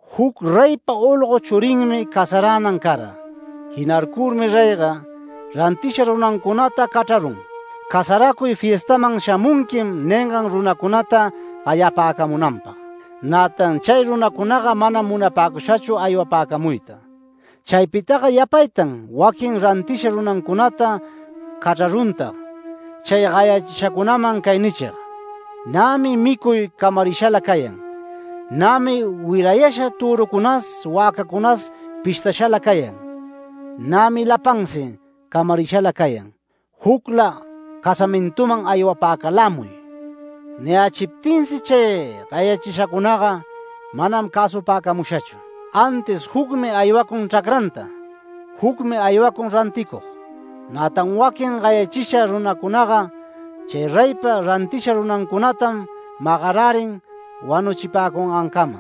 “Juc reypa olgo churinmi casaränan cara. Jinarcurmi reyga, rantisha runancunata cachrarun, casaracuy fiestaman ‘Shamunquim’ ningan runacunata gayapäcamunanpag. Nätan chay runacunaga manam munapäcushachu aywapäcamuyta. Chaypitaga yapaytan waquin rantisha runancunata cachraruntag chay gayachishacunaman cay nichig: ‘Nämi micuy camarishala cayan. Nämi wirayasha törücunas wäcäcunas pishtashala cayan. Nämi lapansi camarishala cayan. Jucla casamintuman aywapäcalämuy’. Niyächiptinsi chay gayachishacunaga manam cäsupäcamushachu, antis jucmi aywacun chracranta, jucmi aywacun ranticug. Nätan waquin gayachisha runacunaga chay reypa rantisha runancunatam magarärin wanuchipäcungancama.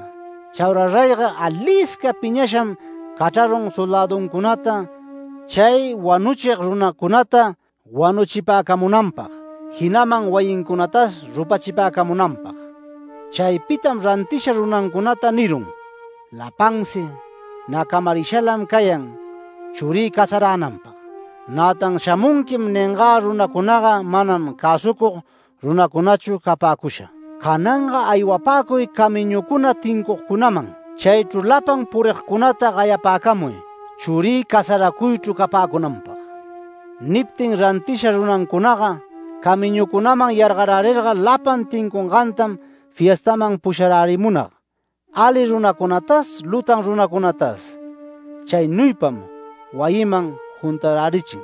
Chaura reyga alisca piñasham cachrarun soldäduncunata chay wanuchig runacunata wanuchipäcamunanpag, jinaman wayincunatas rupachipäcamunanpag. Chaypitam rantisha runancunata nirun: ‘Lapansi nä camarishalam cayan churï casaränanpag. Nätan “Shamunqui” ningä runacunaga manam cäsucug runacunachu capäcusha. Cananga aywapäcuy camiñucuna tincugcunaman chaychru lapan purigcunata gayapäcamuy churï casaracuychru capäcunanpag’. Niptin rantisha runancunaga, camiñucunaman yargarärirga lapan tincungantam fiestaman pusharärimunag, ali runacunatas, lutan runacunatas. Chaynuypam wayiman juntarärichin.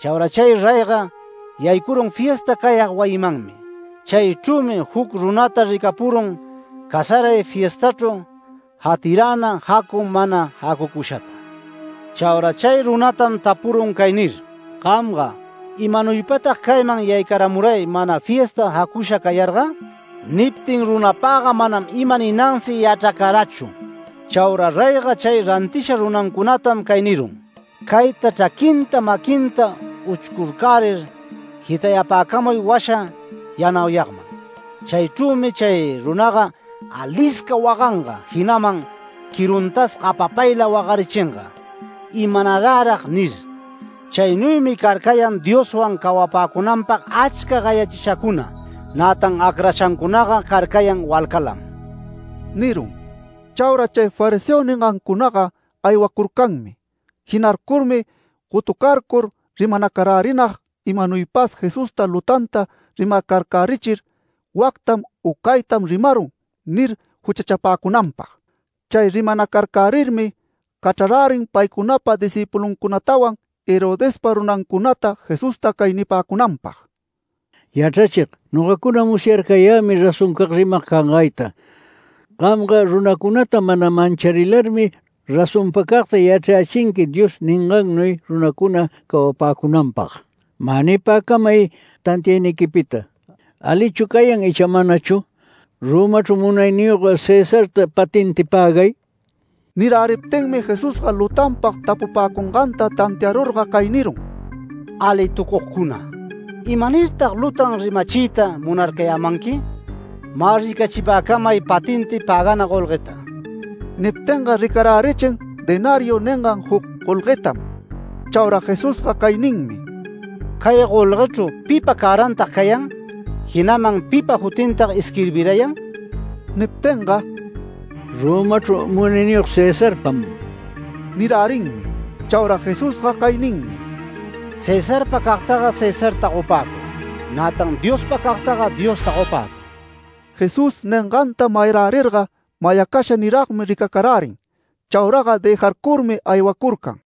Chaura chay reyga yaycurun fiesta cayag wayimanmi. Chaychrümi juc runata ricapurun casaray fiestachru jatiräna jacu, mana jacucushata. Chaura chay runatam tapurun cay nir: ‘Gamga ¿imanuypatag cayman yaycaramuray mana fiesta jacusha cayarga?’ Niptin runapaga manam ima ninansi yachracarachu. Chaura reyga chay rantisha runancunatam cay nirun: ‘Cayta chraquinta maquinta uchcurcärir jitayupäcamuy washa yanauyagman. Chaychrümi chay runaga alisca waganga, jinaman quiruntas gapapayla wagarichinga ¿Imanarärag?’ nirun. Chaynuymi carcayan Dioswan cawapäcunanpag achcam gayachishacuna. Nätan acrashacunaga carcayan walcalam” nirun. Chaura chay fariseo ningancunaga aywacurcanmi. Jinarcurmi gotucarcur rimanacarärinag imanuypas Jesusta lutanta rimarcärichir, “Wactam u caytam rimarun” nir juchachapäcunanpag. Chay rimanacarcärirmi cachrarärin paycunapa discïpuluncunatawan Herodespa runancunata Jesusta cay nipäcunanpag: “Yachrachig, nogacuna musyarcayämi razoncag rimag cangayta. Gamga runacunata mana mancharilarmi, razonpacagta yachrayächinqui Dios ningannuy runacuna cawapäcunanpag. Mä nipäcamay tantiayniquipita, ¿alichu cayan icha manachu, Romachru munayniyog Cesarta patenti pägay?” Niräriptinmi Jesusga lutanpag tapupäcunganta tantiarurga cay nirun: “¡Alitucugcuna! ¿Imanirtag lutan rimachiyta munarcayämanqui? Mä ricachipäcamay patenti pägana golgueta”. Niptinga ricarärichin denariu ningan juc golguetam. Chaura Jesusga cay ninmi: “Cay golguechru ¿pipa cärantag cayan? jinaman ¿pipa jutintag isquirbirayan?” Niptinga “Romachru munayniyog Cesarpam” nirärinmi. Chaura Jesusga cay ninmi: “Cesarpa cagtaga Cesarta gopäcuy. Nätan Diospa cagtaga Diosta gopäcuy”. Jesús ninganta mayarärirga mayacasha niragmi ricacarärin. Chauraga dëjarcurmi aywacurcan.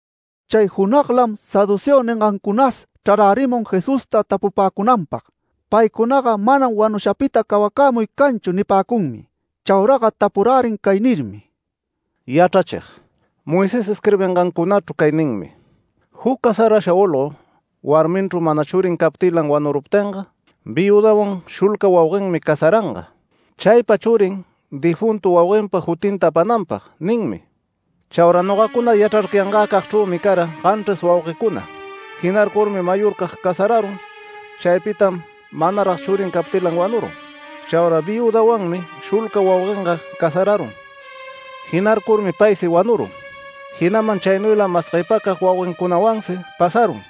Chay junaglam saduceo ningancunas chrarärimun Jesusta tapupäcunanpag. Paycunaga “Manam wanushapita cawacämuy canchu” nipäcunmi. Chauraga tapurärin cay nirmi: “Yachrachig, Moisés isquirbingancunachru cay ninmi: ‘Juc casarasha olgo, warminchru mana churin captilan wanuruptinga, viüdawan shulca wauguenmi casaranga. Chaypa churin, difuntu wauguenpa jutinta apananpag’ ninmi. Chaura nogacuna yachrarcayangäcagchrümi cara ganchris wauguecuna. Jinarcurmi mayorcag casararun. Chaypitam manarag churin captilan wanurun. Chaura viüdanwanmi shulca wauguenga casararun. Jinarcurmi paysi wanurun, jinaman chaynuylam mas guepacag wauguencunawansi pasarun.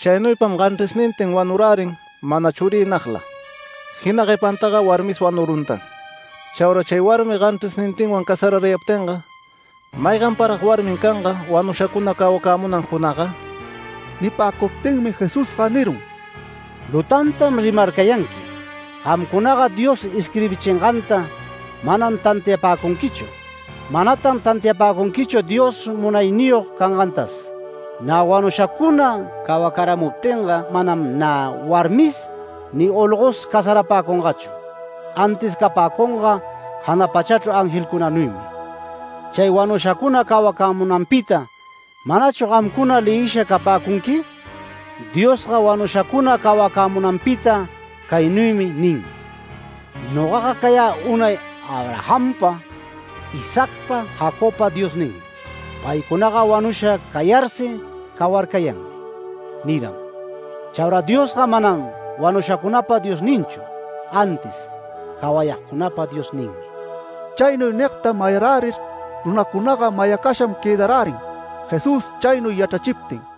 Chaynuypam ganchrisnintin wanurärin mana churiynagla. Jina guepantaga warmis wanuruntan. Chaura chay warmi ganchrisnintinwan casararayaptinga, ¿mayganparag warmin canga, wanushacuna cawacämunan junagga?” Nipäcuptinmi Jesusga nirun: “Lutantam rimarcayanqui. Gamcunaga Dios isquirbichinganta manam tantiapäcunquichu. Manatan tantiapäcunquichu Dios munayniyog cangantas. Nä wanushacuna cawacaramuptinga manam nä warmisi ni olgosi casarapäcungachu, antis capäcunga jana pachachru angelcunanuymi. Chay wanushacuna cawacämunanpita ¿manachu gamcunaga leyisha capäcunqui? Diosga wanushacuna cawacämunanpita caynuymi nin: ‘Nogaga cayä unay Abrahampa, Isaacpa, Jacobpa Diosninmi’. Paycunaga wanusha cayarsi cawarcayanmi, niram. Chaura Diosga manam wanushacunapa Diosninchu, antis cawayagcunapa Diosninmi”. Chaynuy nigta mayarärir, runacunaga mayacasham quëdarärin, Jesús chaynuy yachrachiptin.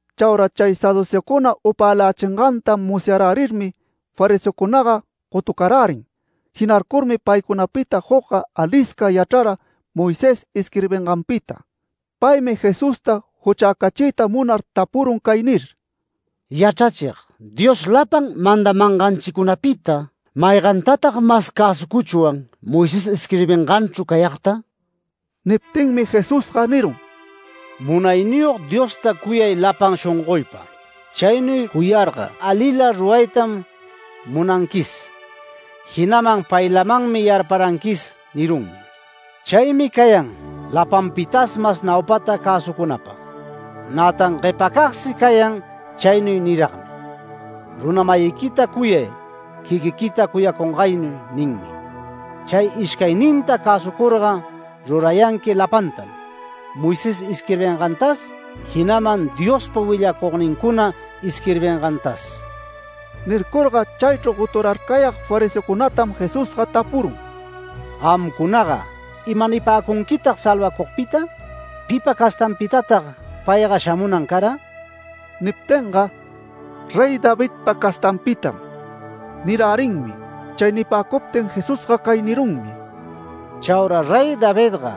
Chaura chay saduceocuna upälächinganta musyarärirmi, fariseocunaga gotucarärin. Jinarcurmi paycunapita jucga alisca yachrara Moisés isquirbinganpita. Paymi Jesusta juchäcachiyta munar tapurun cay nir: “Yachrachig, Dios lapan mandamanganchicunapita, ¿maygantatag mas cäsucuchwan, Moisés isquirbinganchru cayagta?” Niptinmi Jesusga nirun: “ ‘Munayniyog Diosta cuyay lapan shongoypa. Chaynuy cuyarga alila ruraytam munanquis, jinaman paylamanmi yarparanquis’ nirunmi. Chaymi cayan lapanpitas mas naupata cäsucunapag. Nätan guepancagsi cayan chaynuy niragmi: ‘Runa-mayiquita cuyay quiquiquita cuyacungaynuy’ ninmi. Chay ishcayninta cäsucurga rurayanqui lapantam, Moisés isquirbingantas, jinaman Diospa willacugnincuna isquirbingantas”. Nircurga chaychru goturarcayag fariseocunatam Jesusga tapurun: “Gamcunaga ¿ima nipäcunquitag salvacugpita? ¿Pipa castanpitatag payga shamunan cara?” Niptinga “Rey Davidpa castanpitam” nirärinmi. Chay nipäcuptin Jesusga cay nirunmi: “Chaura Rey Davidga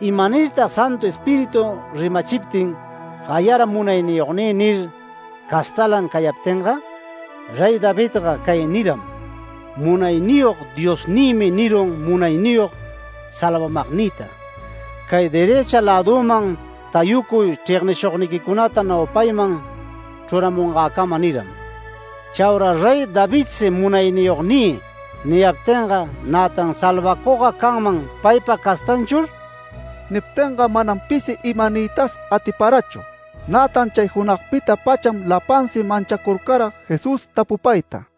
¿imanirtag Santu Espíritu rimachiptin gayara ‘Munayniyognï’ nir, castalan cayaptinga? Rey Davidga cay niram: ‘Munayniyog Diosnïmi nirun munayniyog salvamagnïta: “Cay derëcha lädüman tayucuy chregnishugniquicunata naupayman chruramungäcama” niram’. Chaura Rey Davidsi ‘Munayniyognï’ niyaptinga, nätan ¿Salvacugga canman paypa castanchur?” Niptinga manam pisi ima niytas atiparachu. Nätan chay junagpita-pacham lapansi manchacurcara Jesús tapupayta.